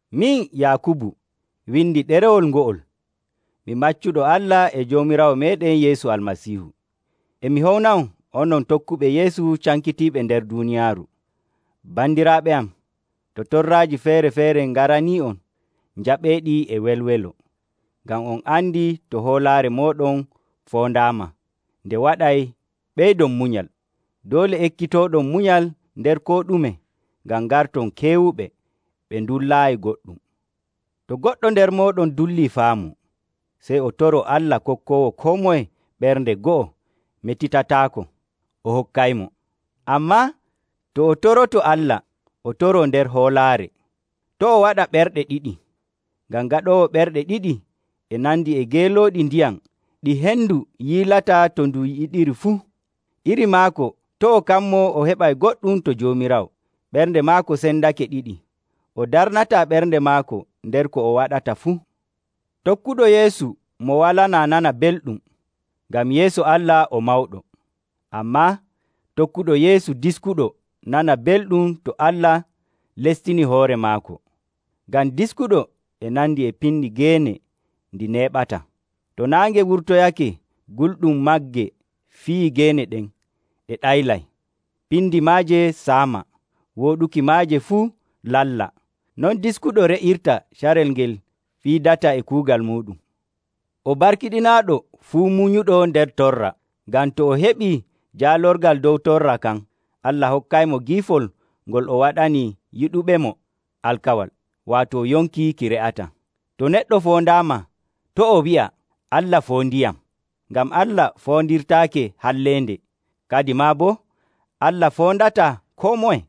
Min, Yaakubu, windi ɗerewol ngo'ol. Mi maccuɗo Allah e Joomiraawo meeɗen Yeesu Almasiihu. E mi howna'on, onon tokkuɓe Yeesu cankitiiɓe nder duuniyaaru. Bandiraaɓe am, to torraaji feere‑feere ngaranii'on, njaɓeeɗi e welwelo, ngam on andi to hoolaare mooɗon foondaama, nde waɗay ɓeydon munyal. Doole ekkitooɗon munyal nder koo ɗume, ngam ngarton keewuɓe, ɓe ndullaayi goɗɗum. To goɗɗo nder mooɗon dullii faamu, sey o toroo Allah kokkoowo koo moye ɓernde go'o metitataako, o hokkaymo. Ammaa to o toroto Allah, o toroo nder hoolaare. To' o waɗa ɓerɗe ɗiɗi, ngam gaɗoowo ɓerɗe ɗiɗi e nandi e geelooɗi ndiyam ɗi hendu yiilata to ndu yiɗiri fuu. Iri maako to' o kammoo o heɓay goɗɗum to Joomiraawo. Ɓernde maako sendake ɗiɗi, o darnataa ɓernde maako nder ko o waɗata fuu. Tokkuɗo Yeesu mo walanaa nana belɗum, ngam yeeso Allah o mawɗo. Ammaa tokkuɗo Yeesu diskuɗo nana belɗum to Allah lestinii hoore maako. Ngam diskuɗo e nandi e piindi geene ndi neeɓataa. To naange wurtoyake gulɗum magge fiyii geene ɗen, ɗe ɗaylay, piindi maaje saama, wooɗuki maaje fuu lalla. Non diskuɗo re'irta carel ngel fiidata e kuugal muuɗum. O barkiɗinaaɗo fuu munyuɗo nder torra, ngam to o heɓii jaalorgal dow torra kan, Allah hokkaymo giifol ngol o waɗani yiɗuɓemo alkawal, waato yonki ki re'ataa. To neɗɗo foondaama, to' o wi'a, “Allah foondiyam.” Ngam Allah foondirtaake halleende, kadimaa boo Allah foondataa koo moye.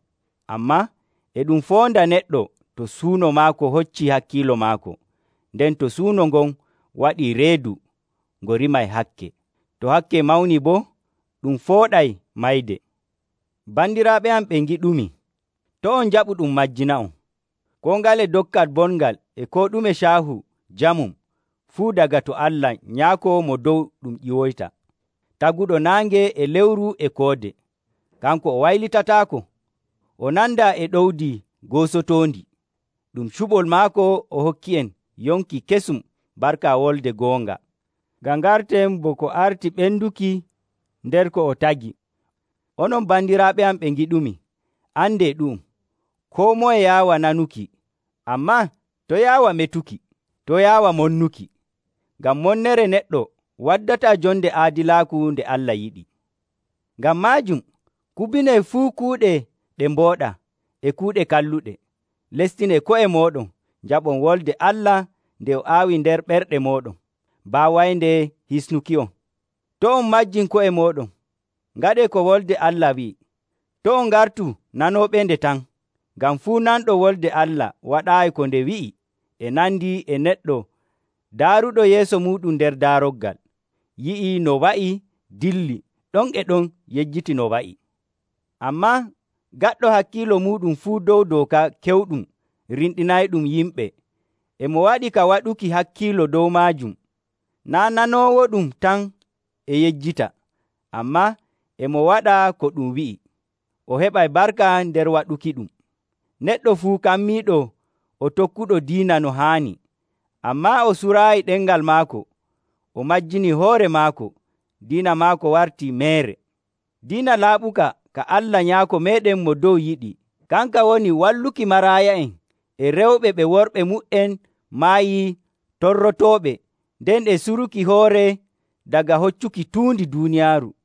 Ammaa e ɗum foonda neɗɗo to suuno maako hoccii hakkiilo maako. Nden to suuno ngon waɗii reedu, ngo rimay hakke. To hakke mawnii boo, ɗum fooɗay mayde. Bandiraaɓe am ɓe ngiɗumi, to' on njaɓu ɗum majjina'on. Koo ngale dokkal bongal e koo ɗume caahu jamum fuu daga to Allah Nyaako Mo Dow ɗum ƴiwoyta, taguɗo naange e lewru e koode. Kanko o waylitataako, o nandaa e ɗowdi goosotoondi. Ɗum cuɓol maako o hokki'en yonki kesum barka wolde goonga, ngam ngarten bo ko arti ɓenduki nder ko o tagi. Onon bandiraaɓe am ɓe ngiɗumi, andee ɗu'um: koo moye yaawa nanuki, ammaa to' yaawa metuki, to' yaawa monnuki. Ngam monnere neɗɗo waddataa jonde aadilaaku nde Allah yiɗi. Ngam maajum, kubinee fuu kuuɗe ɗe mbooɗaa e kuuɗe kalluɗe. Lestinee ko'e mooɗon, njaɓon Wolde Allah nde o aawi nder ɓerɗe mooɗon, baawaynde hisnuki'on. To' on majjin ko'e mooɗon. Ngaɗee ko Wolde Allah wi'i, to' on ngartu nanooɓende tan. Ngam fuu nanɗo Wolde Allah waɗaayi ko nde wi'i e nandi e neɗɗo daaruɗo yeeso muuɗum nder daaroggal, yi'i no wa'i, dilli, ɗon e ɗon yejjiti no wa'i. Ammaa gaɗɗo hakkiilo muuɗum fuu dow dooka kewɗum rimɗinayɗum yimɓe, e mo waɗi ka waɗuki hakkiilo dow maajum, naa' nanoowoɗum tan e yejjita, ammaa e mo waɗa ko ɗum wi'i, o heɓay barka nder waɗukiɗum. Neɗɗo fuu kammiiɗo o tokkuɗo diina no haani, ammaa o suraayi ɗemngal maako, o majjinii hoore maako, diina maako wartii meere. Diina laaɓuka ka Allah Nyaako meeɗen Mo Dow yiɗi, kanka woni walluki maraaya'en e rewɓe ɓe worɓe mu''en maayi torrotooɓe, nden e suruki hoore daga hoccuki tuundi duuniyaaru.